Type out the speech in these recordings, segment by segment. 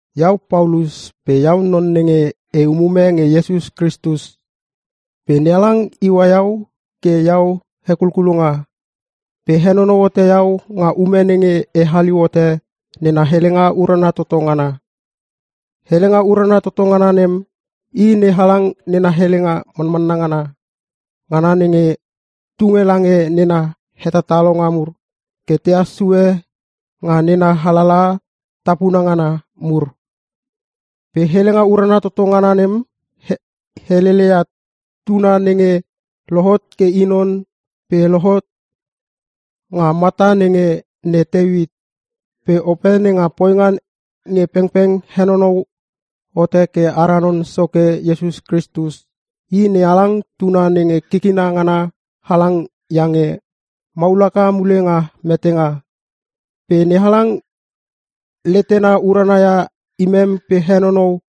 Iau Paulus, pe Iau non nenge e umume nge Iesus Kristus. Pe NeHalang iua iau ke iau hekulkulonga. Pe henonou hote iau nga ume nenge e haliu hote nena helenga urana toto ngana. Helenga urana toto ngana nem, i NeHalang nena helenga manmanna ngana nenge tunge lange nena hetatalonga mur ke tehas sue nga nena alalaha tapuna ngana mur. Pe helenga urana toto ngana nem heleleia Tuna nenge lohot ke i non pe lohot nga mata nenge ne Teuit. Pe Ope nenga poinga nge pengpeng henonou hote ke ara Non Soke Iesus Kristus, i NeHalang Tuna nenge kikina ngana halang iange maul haka mule nga metenga. Pe NeHalang letena urana ia imem pe henonou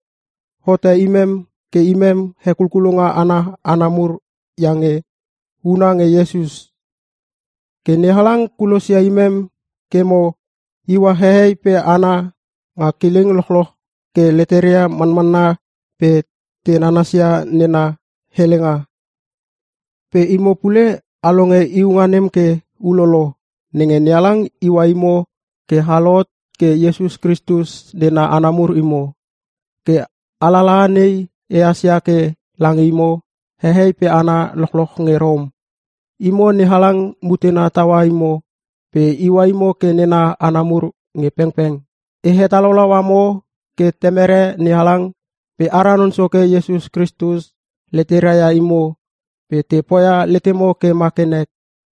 hote imem ke imem hekulkulonga ana hana mur iange huna nge Iesus. Ke NeHalang kulosia imem ke mo iua hehei pe hana nga kileng lochloch ke leteria manmanna pe te nanasia nena helenga. Pe imo pule a longe iunga nem ke ulolo, nenge NeHalang iua imo ke a lohot ke Iesus Kristus nena hana mur imo. Ke alalaha nei ehas ia ke lange imo hehei pe hana lochloch nge Rom. Imo NeHalang mutena taua imo pe iua imo ke nena hana mur nge pengpeng. E hetalaulau amo ke Temere NeHalang pe ara Non Soke Iesus Kristus leteria ia imo pe te poia letemo ke ma ke nek.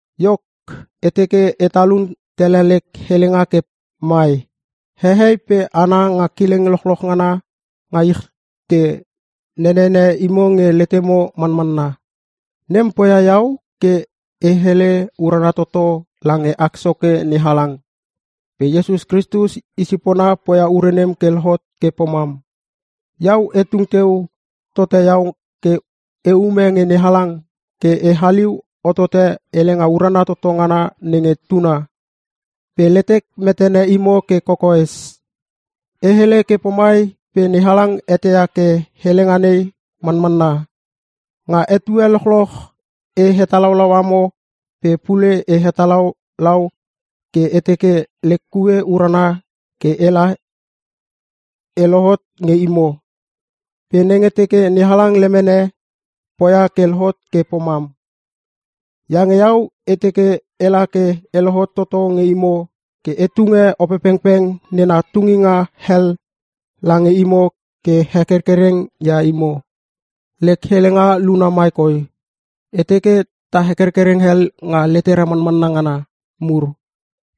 Iok, e teke e talun tele lek helenga ke mai: Hehei pe hana nga kileng lochloch ngana nga ich te nenene imo nge letemo manmanna. Nem poia iau ke e hele urana toto lange ak Soke NeHalang. Pe Iesus Kristus i sipona poia ure nem ke lohot ke pomam. Iau e tung teu tote iau ke e ume nge NeHalang ke e haliu hotote helenga urana toto ngana nenge Tuna, pe letek metene imo ke kokoes. E hele ke pomai pe NeHalang eteia ke helenga nei manmanna. Nga etue lochloch e hetalaulau amo pe pule e hetalaulau ke e teke lek kue urana kela e lohot nge imo, pe nenge teke NeHalang lemene, poia ke lohot ke pomam. Iange iau e teke ela ke e lohot toto nge imo ke e tunge Opepengpeng nena tunginga hel lange imo ke hekerkereng ia imo. Lek helenga luna mai koi: E teke ta hekerkereng hel nga letera manmanna ngana mur.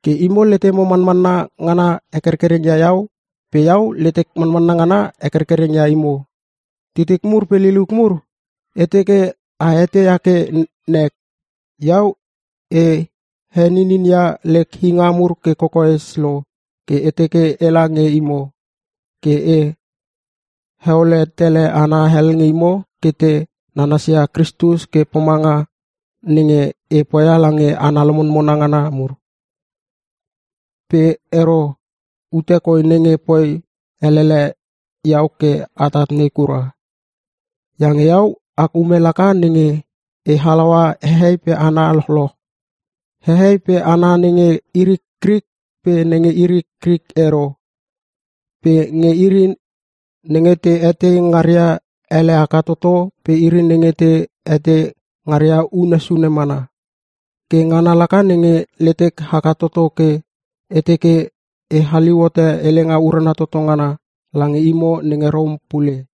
Ke imo letemo manmanna ngana hekerkereng ia iau pe iau letek manmanna ngana hekerkereng ia imo. Titik mur pe liliuk mur, e teke a eteia ke nek. Iau e heninin ia lek inga mur ke kokoes lo ke e teke ela nge imo, ke e heole tele hana hel nge imo ke te nanasia Kristus ke pomanga nenge e poia lange hana lomonmona ngana mur. (Pe ero, ute koi nenge poi elele iau ke atat nei kura.) Iange iau ak ume laka nenge e halaua hehei pe hana lochloch. Hehei pe hana nenge iri Krik pe nenge iri Krik ero. Pe nge iri nenge te etei ngaria ele haka toto pe iri nenge te etei ngaria unne sune mana. Ke ngana laka nenge letek haka toto ke e teke e haliu hote helenga urana toto ngana lange imo nenge Rom pule.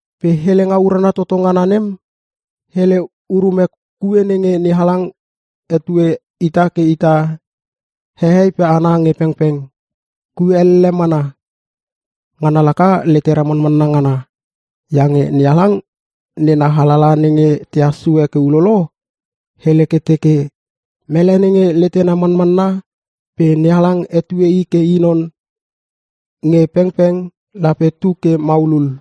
Pe helenga urana toto ngana nem, hele urume kue nenge NeHalang hetue ita ke ita hehei pe hana nge pengpeng. Kue elle mana. Ngana laka letera manmanna ngana. Iange NeHalang nena alalaha nenge tehas sue ke ulolo, hele ke teke, “Mele nenge letena manmanna pe NeHalang hetue i ke i non nge pengpeng, lape tu ke maulul.”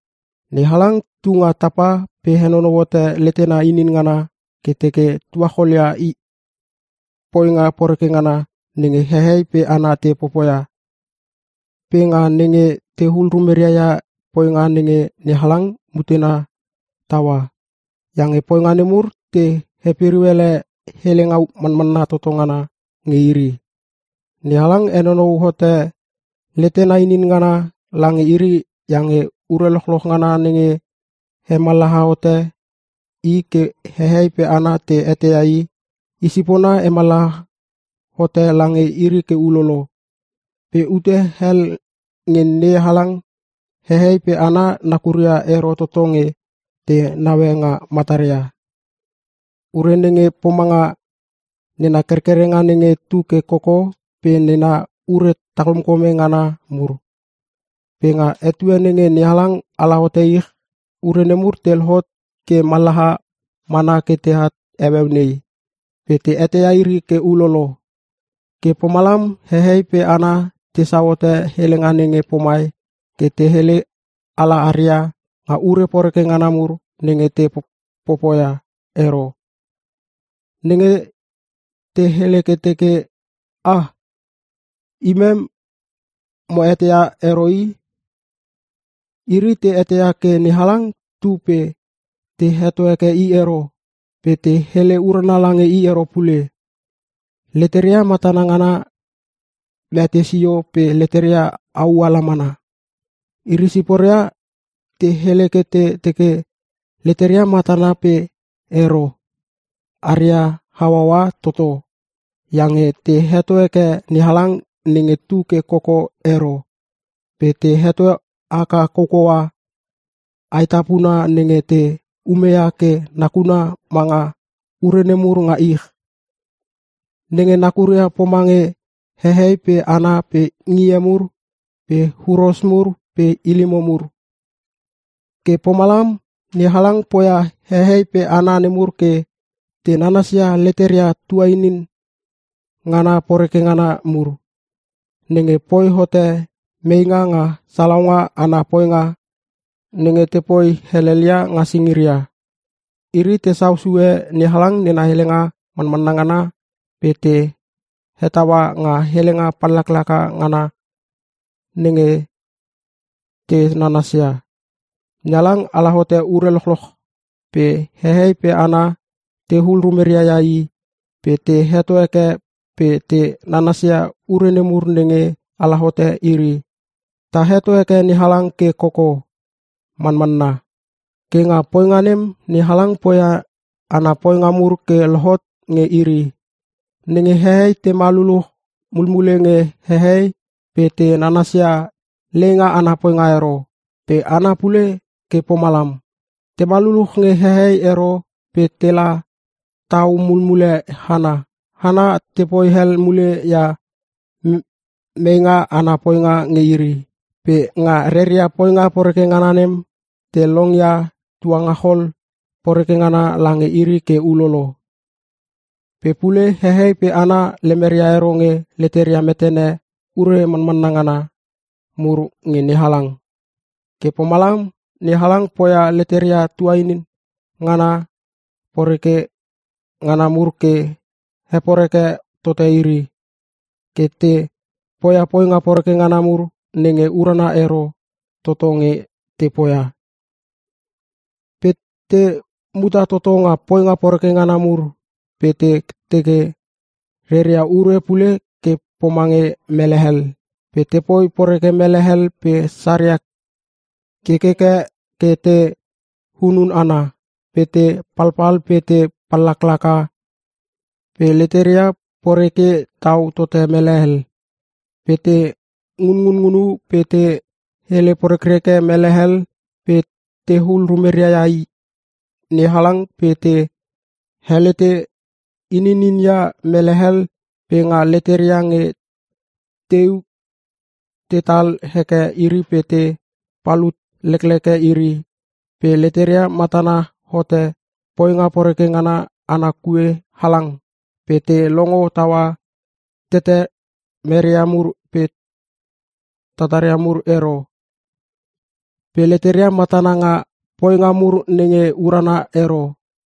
NeHalang tu nga tapa pe henonou hote letena inin ngana ke teke tuachol ia poinga poreke ngana nenge hehei pe hana te popoia, pe nga nenge tehul rumeria ia poinga nenge NeHalang mutena taua. Iange poinga nemur te hepiriu ele helenga manmanna toto ngana nge iri. NeHalang henonou hote letena inin ngana lange iri iange ure lochloch ngana nenge hemallaha hote i ke hehei pe hana te eteia I, i sipona hemallaha hote lange iri ke ulolo. Pe ute hel nge NeHalang, hehei pe hana nakuria ero toto nge te naue nga mataria. Ure nenge pomanga; Nena kerkerenga nenge tu ke koko pe nena ure talkomkome ngana mur. Pe nga etue nenge NeHalang ala hote ich, ure nemur te lohot ke mallaha mana ke at heueu nei pe te eteia iri ke ulolo. Ke pomalam hehei pe hana tesau hote helenga nenge pomai ke te hele ala aria nga ure poreke ngana mur nenge te popoia ero: Nenge te hele ke teke, “Ah! Imem mo eteia ero i!” Iri te eteia ke NeHalang tu pe te heto heke i ero pe te hele urana lange i ero pule. Leteria matana ngana mete sio pe leteria au ala mana. Iri siporia te hele ke te teke leteria matana pe ero, aria hauaua toto iange te heto heke NeHalang nenge tu ke koko ero pe te heto haka koukoua aetapuna nenge te umeia ke nakuna manga ure nemur nga ich. Nenge nakuria pomange hehei pe hana pe ngie mur pe huros mur pe ilimo mur. Ke pomalam NeHalang poia hehei pe hana nemur ke te nanasia leteria tuanin ngana poreke ngana mur, nenge poi hote meinga nga salaunga ana poinga nenge tepoi helelia nga singiria. Iri tesau sue NeHalang nena helenga manmanna ngana pe te hetaua nga helenga pallaklaka ngana nenge te nanasia. NeHalang ala hote ure lochloch pe hehei pe hana tehul rumeria ia i pe te heto heke pe te nanasia ure nemur nenge ala hote iri. Ta heto heke NeHalang ke koko. Manmanna! Ke nga poinga nem NeHalang poia meinga ana poinga mur ke lohot nge iri. Nenge hehei tema luluch mulmule nge hehei pe te nanasia leinga ana poinga ero. Pe hana pule ke pomalam. Tema luluch nge hehei ero pe tela tau mulmule hana. Hana tepoi hel mule ia meinga ana poinga nge iri. Pe nga reria poinga poreke ngana nem, te longia tuangachol poreke ngana lange iri ke ulolo. Pe pule hehei pe hana lemeria ero nge leteria metene ure manmanna ngana mur nge NeHalang. Ke pomalam NeHalang poia leteria tuanin ngana poreke ngana mur ke heporeke tote iri, ke te poia poinga poreke ngana mur nenge urana ero toto nge te poia. Pe te muta toto nga poinga poreke ngana mur pe te teke reria ure pule ke pomange mele hel, pe tepoi poreke mele hel pe saria kekeke ke te hunun hana, pe te palpal pe te pallaklaka, pe leteria poreke tau tote mele hel. Pe te ngunngunu pe te hele porekreke mele hel, pe tehul rumeria ia NeHalang pe te helete ininin ia mele hel, pe nga leteria nge teu tetal heke iri pe te palut lekleke iri, pe leteria matana hote poinga poreke ngana ana kue halang pe te longo taua tetemeria mur pe tataria mur ero. Pe leteria matana nga poinga mur nenge urana ero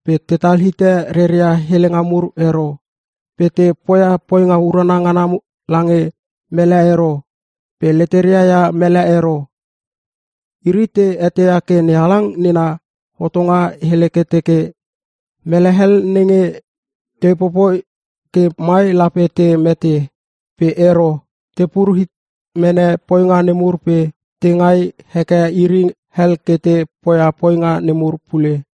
pe tetal hite reria helenga mur ero, pe te poia poinga urana ngana lange mele ero pe leteria ia mele ero. Iri te eteia ke NeHalang nena hotonga hele ke teke, mele hel nenge te popoi ke mai lape te mete. Pe ero, tepur hit mene poinga nemur pe te ngai heke iri hel ke te poia poinga nemur pule.